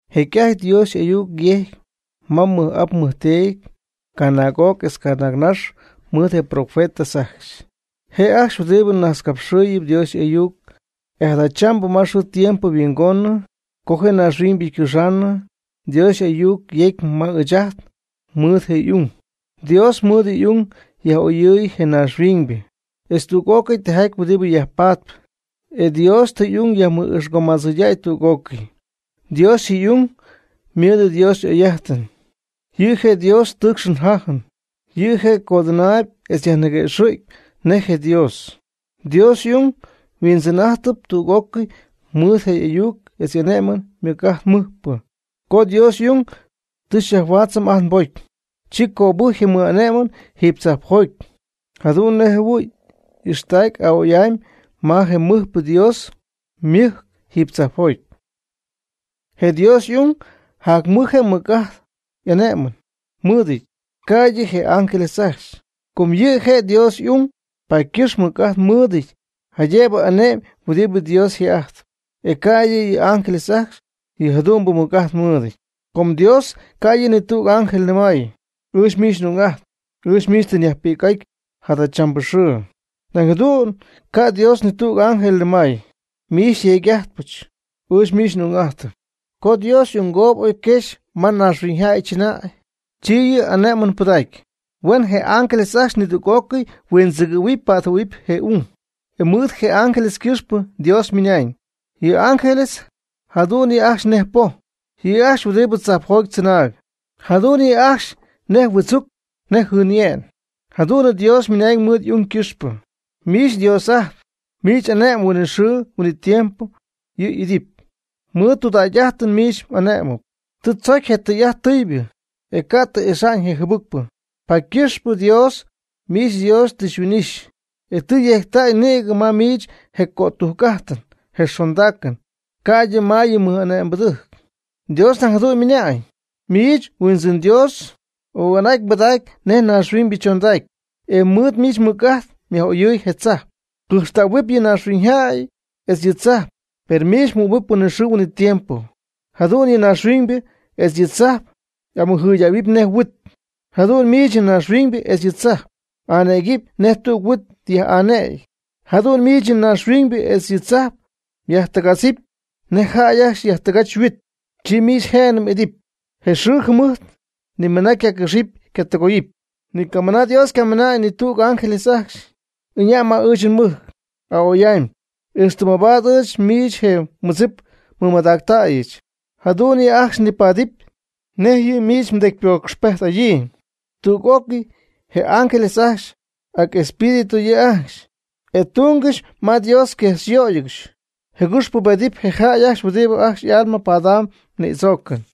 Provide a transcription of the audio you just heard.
Jecy'ajty Dios ayuc yejcy ma ajt nmɨj'ap nmɨjteedy canaag'oc etz canaagnax mɨɨd je yprofetas ajcxy, je' ajcxy huɨdibɨ najtzcapxɨɨy Dios y'ayuc. E jadachambɨ ma xɨɨ tiempo yhuingoonɨ co je naaxhuiñybɨ ycɨxanɨ, Dios ayuc yecy ma ɨɨch ajt mɨɨd je' y'ung. Dios mɨɨd y'ung yaj'oyɨɨy je naaxhuiñybɨ etz tüg'ócɨy tijaty huɨdibɨ yajpatp. E Dios tɨ y'ung yajmɨgo'ixmadzɨydäy tüg'ócɨy. Dios y'ung ymɨɨd Dios y'oy'ájtɨn, yɨ' je' Dios ytɨɨcxɨn'ajtpy yjajɨn'ajtpy. Yɨ' je' codɨnaayb etz yajniguëxɨ̈gy nej je' je Dios. Dios y'ung huijtz'ijtaayb tüg'ócɨy mɨɨd je' y'ayuc etz ane'mɨn mɨc'ajt mɨɨdpɨ. Co Dios y'ung tɨ xyajhuaatzɨm ajt nbocy, chi cöbɨjcy je mɨj'ane'mɨn jiiby tzajpjoty, jadu'n nej jɨhuɨ̈y y'ixtacy a'oy'amy ma je mɨjpɨ Dios ymɨjc jiiby tzajpjoty. Je Dios y'ung jac mɨj je' ymɨc'ajt y'ane'mɨn mɨɨdɨty, ca'ydɨ je ángeles ajcxy. Com yɨ' je' Dios y'ung, paady ycɨxpɨ mɨc'ajt mɨɨdɨty jaydëbɨ ane'my huɨdibɨ Dios yje'ajtpy, e ca'ydɨ yɨ ángeles ajcxy yɨ jadu'mbɨ mɨc'ajt mɨɨd. Com Dios ca' yɨ' ni tüg ángel nɨmay: Ɨɨch miich n'ung'ajtpy. Ɨɨch miich tɨ nyajpi'c'aty jadachambɨ xɨɨ. Nañ jadu'n ca' Dios ni tüg ángel nɨmay: Miich xyteedy'adɨɨbɨch, ɨɨch miich n'ung'adɨɨyb. Co Dios y'ungoob oy quexy ma naaxhuiñyjäy chɨnäy, chi yɨ' ane'mɨn pɨdacy: Huen je ángeles ajcxy nidüg'ócɨy huindzɨgɨ̈huɨpy pa'tjɨhuɨ̈huɨpy je' y'ung. E mɨɨd je ángeles ycɨxpɨ, Dios ymɨna'ñ: Yɨ ángeles jadu'n yɨ' ajcxy nej poj. Yɨ' ajcxy huɨdibɨ tzajpjoty tzɨnaayb, jadu'n yɨ'ajcxy nej huɨdzuc, nej jɨɨnye'n. Jadu'n Dios ymɨnañ mɨɨd y'ung ycɨxpɨ: Miich, Dios'ajtp, miich m'ane'mɨn huinɨxɨɨ huinɨtiempo yɨ' y'ɨdɨpy. Mɨɨd mdudägy'ajtɨn miich m'ane'mɨpy. Tɨ mdzocy je tɨy'ajt tɨybɨ, e ca' tɨ m'ixa'ñ je jɨbɨcpɨ. Paady ycɨxpɨ Dios, miich mDios, tɨ xyhuin'ixy, e tɨ yejctäy nïgɨ ma miich je jotcujc'ajtɨn je xondaacɨn, ca'ydɨ ma yɨ mmɨ'ane'mbɨdɨjc. Dios nañ jadu'n ymɨna'ñ: Miich, Huindzɨn Dios, oga'n'aty mbɨdac nej naaxhuiñybɨ chondacy, e mɨɨd miich mmɨc'ajt myaj'oyɨɨy je tzajp. Cɨjxtähuɨp yɨ naaxhuiñybɨ etz yɨ tzajp, per miich huɨ'mɨp huinɨxɨɨ huinɨtiempo. Jadu'n yɨ naaxhuiñybɨ etz yɨ tzajp y'amɨjɨydähuɨpy nej huit. Jadu'n miich yɨ naaxhuiñybɨ etz yɨ tzajp m'anëgɨpy nej tüg huit yaj'anëgyɨn. Jadu'n miich yɨ naaxhuiñybɨ etz yɨ tzajp myajtɨgadzɨpy nej jäy ajcxy yajtɨgach yhuit. Chi miich je'nɨ m'idɨpy, je mxɨɨ mjɨmɨjt ni mɨna ycacɨxɨpy ycatɨgoyɨpy. Ni camɨna Dios canɨmay ni tüg je ángeles ajcxy: Ɨña' ma ɨɨch nmɨjc a'oy'amy, ixtɨ mabaad ɨɨch miich je mmɨdzip nmɨmadactäyɨch, jadu'n yɨ'ajcxy nipaadɨpy nej yɨ' miich mdecypocxpejt'adyii. Tüg'ócɨy je ángeles ajcxy ac espíritu yɨ' ajcxy, e ytungɨxy ma Dios, yquexyöygɨxy jɨgɨx pubedɨpy je jäy ajcxy huɨdibɨ ajcxy y'alma padam ñïdzoocɨn.